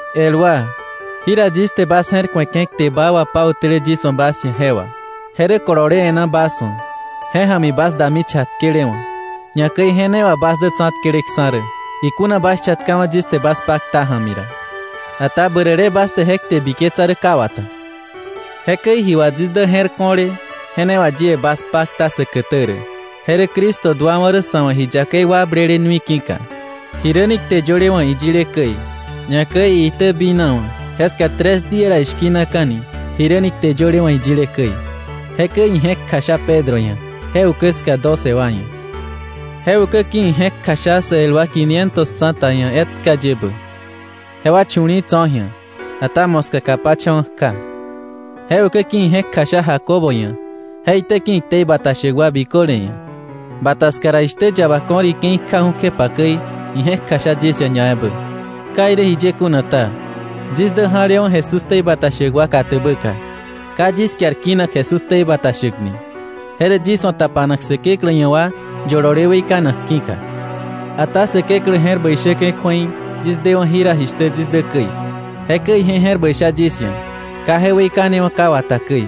El wa, jira yis te bas je̱r ku̱eke̱ kte baa wapautäle yis wa̱ bas ia̱ je wà, je rä kolole e̱ná bas wa̱, je ja̱mi bas dami chatkelewa̱. Ñakäi je ne wà bas dä tsa̱tkeleksa̱ rä, ikuna bas chatkawa̱ yis te bas pakta ja̱mi ra. Ata bärä le bas te je kte biketsa rä ka wata. Jekäi ji wà yis dä je̱r ko̱le, je ne wà yie bas pakta säkätä rä. Je rä Cristo duawa̱ rä sa̱ wa̱ ji yakei wakblele nui ki̱ka, jiräni kte yöle wa̱ iyile käi; ñakäi iitäbinawa̱, jeska tres día ra ishki̱naka̱ni jiräni kte yöle wa̱ iyile käi; jekäi ije̱k kjasha Pedro ia̱, je ukä ska doce wa ia̱. Je ukä ki̱ ije̱k kjasha sä el wa quinientos tsa̱ta ia̱ etkayebä, jewa chu̱li̱i̱ tso̱ ji̱a, ata moska kapacha̱wa̱ kja. Je ukä ki̱ ije̱k kjasha Jacobo ia̱, je itäki̱ iktei bata shäk wa biköle ia̱. Bata ska ra, jishtä yaba ko̱r ike̱i kjäju̱ kjepa käi, ije̱k kjasha yis ia̱ ñaebä. Ka irä jiye kuna ta, yis dä ja̱lewa̱ Jesús ktei bata shäk wa katäbäka. Ka yis kiar kinak Jesús ktei bata shäk ni. Je rä yis wa̱ tapanak Säkeklä ia̱ wa yolole weikanak ki̱ka. Ata Säkeklä je̱r bäi shäke̱ kju̱ei yis dewa̱ jira jishtä yis dä käi; jekäi ije je̱r bäi sha yis ia̱, ka je weikanewa̱ ka wata käi.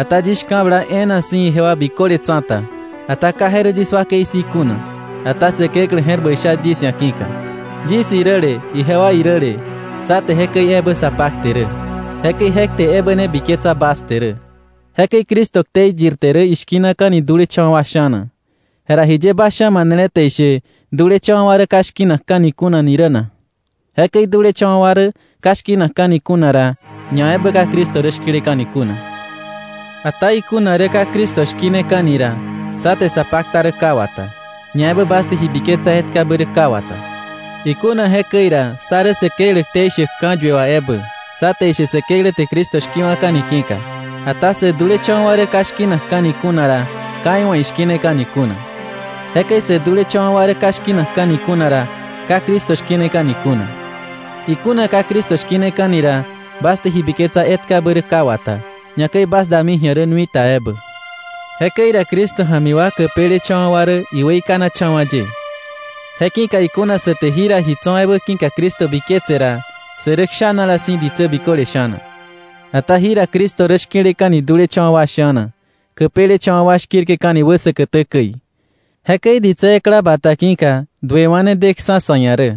Ata yis shka̱bla e̱e̱na si̱ ijewa biköle tsa̱ta, ata ka je rä yis wakei si̱ kuna, ata Säkeklä je̱r bäi sha yis ia̱ ki̱ka. Yis iräle ijewa iräle, sá te jekäi ebä sa pakte rä. Jekäi je kte ebä ne biketsa bas te rä. Jekäi Cristo ktei yirte rä ishki̱naka̱ni dulecha̱wa̱ wa sha̱na, jera ¿jiye bas sha̱na manele te ishe dulecha̱wa̱ wa rä ka shki̱nakka̱ni kuna ni rä na? Jekäi dulecha̱wa̱ wa rä ka shki̱nakka̱ni kuna ra, ñaebä ka Cristo rä shki̱leka̱ni kuna. Ata ikuna rä ka Cristo shki̱neka̱ni ra, sá te sa pakta rä ka wata, ñaebä bas te ji biketsa etkabä rä ka wata. Ikuna jekäi ra, sá rä Säkeklä ktei shäk ka̱yue wà ebä, sá te ishe Säkeklä te Cristo shki̱wa̱ka̱ni ki̱ka. Ata sä dulecha̱wa̱ wa rä ka shki̱nakka̱ni kuna ra, ka iwa̱ ishki̱neka̱ni kuna. Jekäi sä dulecha̱wa̱ wa rä ka shki̱nakka̱ni kuna ra, ka Cristo shki̱neka̱ni kuna. Ikuna ka Cristo shki̱neka̱ni ra, bas te ji biketsa etkabä rä ka wata, ñakäi bas dami ji̱a rä nui ta ebä. Jekäi ra Cristo ja̱mi wa käpelecha̱wa̱ wa rä iweikanacha̱wa̱ ye. Je ki̱ka ikuna sä te jira ji tso̱ ebä ki̱ka Cristo biketse ra, sä rä kshanala si̱ ditsä biköle sha̱na. Ata jira Cristo rä shki̱leka̱ni dulecha̱wa̱ wa sha̱na, käpelecha̱wa̱ wa shki̱rke̱ni wä säkätä käi. Jekäi ditsä ekla bata ki̱ka duewa̱ ne deksa̱ sa̱ ia̱ rä,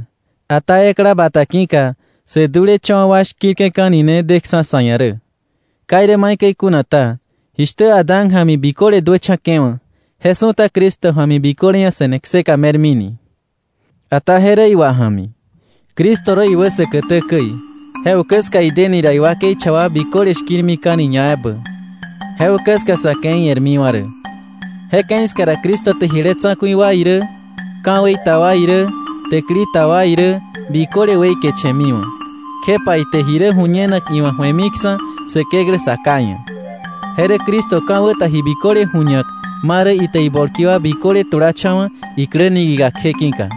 ata ekla bata ki̱ka sä dulecha̱wa̱ wa shkirka̱ni ne deksa̱ sa̱ ia̱ rä. Ka irä maikäi kuna ta, jishtä Adán ja̱mi biköle duächa̱ke̱wa̱, je su̱ta Cristo ja̱mi biköle ia̱ se̱ne kseka me̱rmini. Ata je rä iwa ja̱mi. Cristo rä iwä säkätä käi, je ukä ska ideni ra iwakei cha wa biköle shki̱rmika̱ni ñaebä. Je ukä ska sa̱ ke̱i e̱rmiwa̱ rä. Je ke̱i ska ra Cristo te jile tsa̱ku̱i wa irä ka̱wei ta wa irä täkili ta wa irä biköle weikeche̱miwa̱, kjepa ite ji rä ju̱ñenak iwa̱ ju̱emiksa̱ Säkeklä Sa Ká ia̱. Je rä Cristo ka̱wä ta ji biköle ju̱ñak ma rä ite ibolki wa biköle tulacha̱wa̱ iklä niki̱ka kje ki̱ka.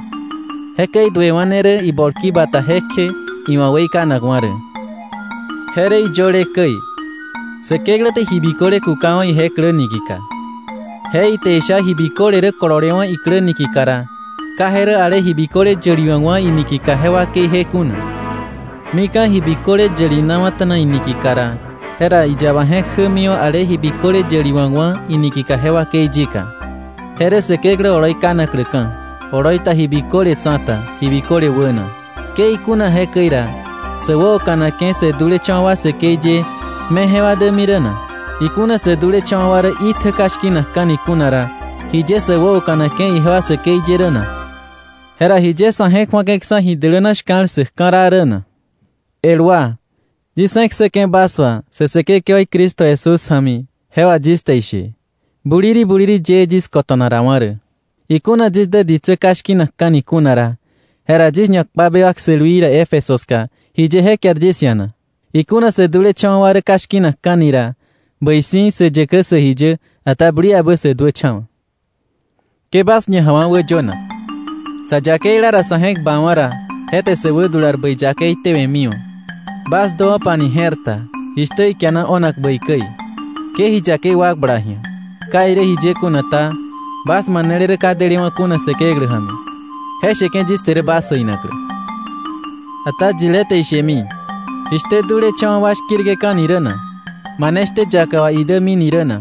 Jekäi duewa̱ ne rä ibolki bata jekje iwa̱ weikanakwa̱ rä. Je rä iyöle käi: “Säkeklä te ji biköle kukawa̱ ije klä niki̱ka.” Je ite isha ji biköle rä kololewa̱ iklä niki̱ka ra, ka je rä ale ji biköle yäliwa̱kwa̱ iniki̱ka je wakeije kuna. Mika̱ ji biköle yälinawa̱ta̱na iniki̱ka ra, jera iyaba je̱k jämiwa̱ ale ji biköle yäliwa̱kwa̱ iniki̱ka je wakei yika. Je rä Säkeklä oloi kanakläka̱ oloi ta ji biköle tsa̱ta ji biköle wäna. Ke ikuna jekäi ra, ¿sä wäoka̱nake̱ sä dulecha̱wa̱ wa säkei ye me jewa dämi rä na? Ikuna sä dulecha̱wa̱ wa rä itjä ka shki̱nakka̱ni kuna ra, ¿jiye sä wäoka̱nake̱ ijewa säkei ye rä na? ¿Jera jiye sa̱ je̱k ju̱ake̱ksa̱ ji däläna shka̱l ssäk ka̱raa rä na? El wa, yis je̱k ssäke̱ bas wa sä Säkekewaí Cristo Jesús ja̱mi je wà yis te ishe, buliri buliri yëë yis kota̱narawa̱ rä. Ikuna yis dä ditsä ka shki̱nakka̱ni kuna ra, jera yis ñakpa bewak sälwii ra Éfeso ska, ¿jiye je kiar yis ia̱? Ikuna sä dulecha̱wa̱ wa rä ka shki̱nakka̱ni ra, bäi si̱ “sä yäkä sä ji yä, ata buliabä sä duächa̱wa̱.” Ke bas ñajawa̱ wäyönak. “Sa yakeila ra, sa̱ je̱k bawa̱ ra, je te sä wädular bäi yakei tewe̱miwa̱.” Bas däwo̱pani je̱r ta, jishtä ikiana o̱nak bäi käi. Ke ji yakei wakbla ji̱a. Ka irä jiye kuna ta, bas manele rä ka delewa̱ kuna Säkeklä ja̱mi. Je sheke̱ yis te rä bas äinaklä. Ata yilé te ishemi: “¿Jishtä dulecha̱wa̱ wa shki̱rke̱ka̱ni rä na? ¿Mane shtä yaka wà idämini rä na?”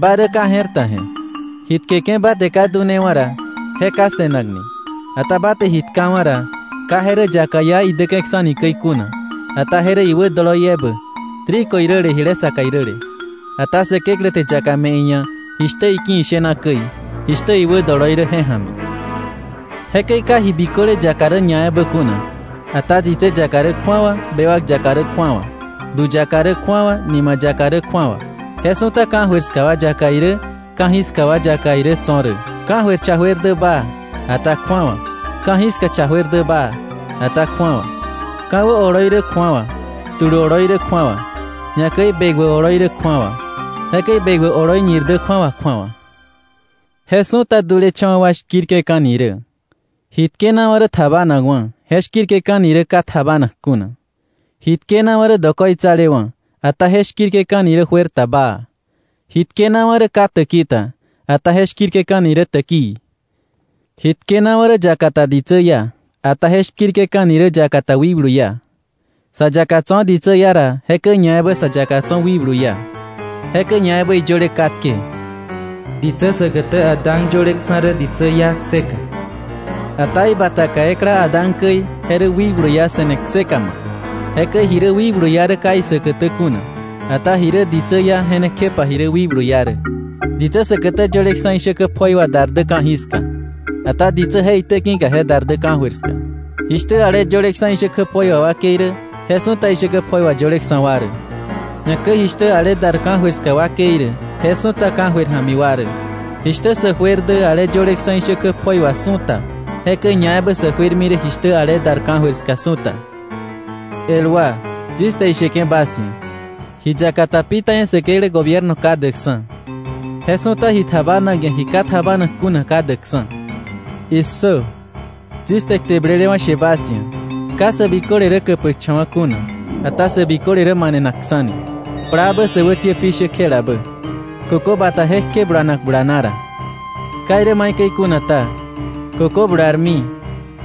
¡Ba rä ka je̱r ta je̱! Ji tkeke̱ ba te ka dunewa̱ ra, je ka se̱nakni. Ata ba te ji tkawa̱ ra, ka je rä yaka iá idäke̱ksa̱ni käi kuna, ata je rä iwä doloi ebä, trigo iräle jile saka iräle. Ata Säkeklä te yaka me̱ iia̱ jishtä iki̱ ishena käi, jishtä iwä doloi rä je ja̱mi. Jekäi ka ji biköle yaka rä ñaebä kuna, ata ditsä yaka rä kju̱awa, bewak yaka rä kju̱awa, du yaka rä kju̱awa, nima yaka rä kju̱awa. Je su̱ta ka̱jöir ska wa yaka irä, ka̱jiska wa yaka irä tso̱ rä. Ka̱jöir cha juer dä baa, ata kju̱awa, ka̱jiska cha juer dä baa, ata kju̱awa. Ka̱wä oloi rä kju̱awa, tulu oloi rä kju̱awa, ñakäi bekwä oloi rä kju̱awa. Jekäi bekwä oloi ñir dä kju̱awa kju̱awa. Je su̱ta dulecha̱wa̱ wa shki̱rke̱ka̱ni rä. Ji tkenawa̱ rä tjabanakwa̱, je shki̱rke̱ka̱ni rä ka tjabanak kuna. Ji tkenawa̱ rä dokoitsalewa̱, ata je shki̱rke̱ka̱ni rä juer ta baa. Ji tkenawa̱ rä ka täki ta, ata je shki̱rke̱ka̱ni rä täkii. Ji tkenawa̱ rä yaka ta ditsä iá, ata je shki̱rke̱ka̱ni rä yaka ta wikblu iá. Sa yaka tso̱ ditsä iá ra, jekäi ñaebä sa yaka tso̱ wikblu iá. Jekäi ñaebä iyöle katke: “Ditsä säkätä Adán yöleksa̱ rä ditsä iá kseka,” ata ibataka ekla Adán käi, je rä wikblu iá se̱ne kseka ma̱k. Jekäi ji rä wikblu iá rä ka isäkätä kuna, ata ji rä ditsä iá, je ne kjepa ji rä wikblu iá rä. Ditsä säkätä yöleksa̱ ishäkä pjoi wà dar dä ka̱jiska; ata ditsä je itäki̱ je dar dä ka̱jöir ska. Jishtä ale yöleksa̱ ishäkä pjoi wà wakei rä, je su̱ta ishäkä pjoi wà yöleksa̱ wa rä. Ñakäi jishtä ale dar ka̱jöir ska wakei rä, je su̱ta ka̱jöir ja̱mi wa rä. Jishtä sä juer dä ale yöleksa̱ ishäkä pjoi wà su̱ta; jekäi ñaebä sä juermi rä jishtä ale dar ka̱jöir ska su̱ta. El wa, yis te isheke̱ bas ia̱, ji yaka ta pi ta ia̱ Säkeklä gobierno ka däkksa̱. Je su̱ta ji tjabanak ia̱ ji ka tjabanak kuna ka däkksa̱. ¡Issö! Yis te kte blelewa̱ she bas ia̱: Ka sä biköle rä käpäkcha̱wa̱ kuna, ata sä biköle rä manenakksa̱ni, plaabä sä wätiä pishä kjelabä, kökö bata jekje bulanak bulana ra. Ka irä maikäi kuna ta, kökö bularmi,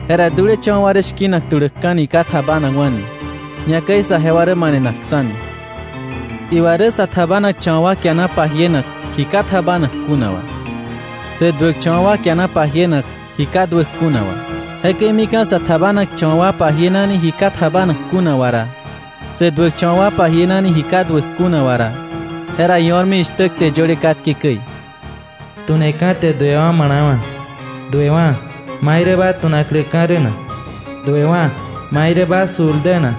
jera dulecha̱wa̱ wa rä shki̱nak tuläkka̱ni ka tjabanakwa̱ni, ñakäi saje wa rä manenakksa̱ni. Iwa rä sä tjabanakcha̱wa̱ wa kiana pajienak ji ka tjabanak kuna wà. Sä duäkcha̱wa̱ wa kiana pajienak ji ka duäk kuna wà. Jekäi mika̱ sä tjabanakcha̱wa̱ wa pajienani ji ka tjabanak kuna wà ra, sä duäkcha̱wa̱ wa pajienani ji ka duäk kuna wà ra, jera io̱rmi jishtä kte yöle katke käi: “Tu̱neka̱ te duewa̱ ma̱la̱wa̱wa̱.” Duewa̱, ¿mai rä ma tu̱nakläka̱ rä na? Duewa̱, ¿mai rä ba sul dä na?”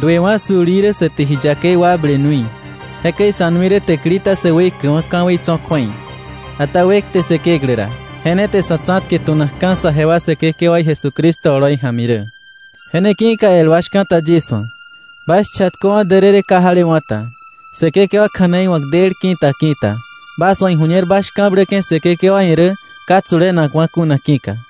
Duewa̱ sul í rä sä te ji yakei wakble nui. Jekäi sa̱ nui rä täkili ta sä weikäkwa̱ ka̱wei tso̱ kju̱ei. Ata wekte Säkeklä ra. ¡Je ne te sa̱ tsa̱tke tu̱nakka̱ saje wa Säkekewaí Jesucristo oloi ja̱mi rä! Je ne ki̱ka el wa shka̱ta yis wa̱, bas chatköwa̱ därërë ka jalewa̱ ta Säkekewa kja̱nei wa̱k del ki̱ta ki̱ta, bas wa̱ iju̱ñer bas shka̱bläke̱ Säkekewa ia̱ rä ka tsulenakwa̱ kuna ki̱ka.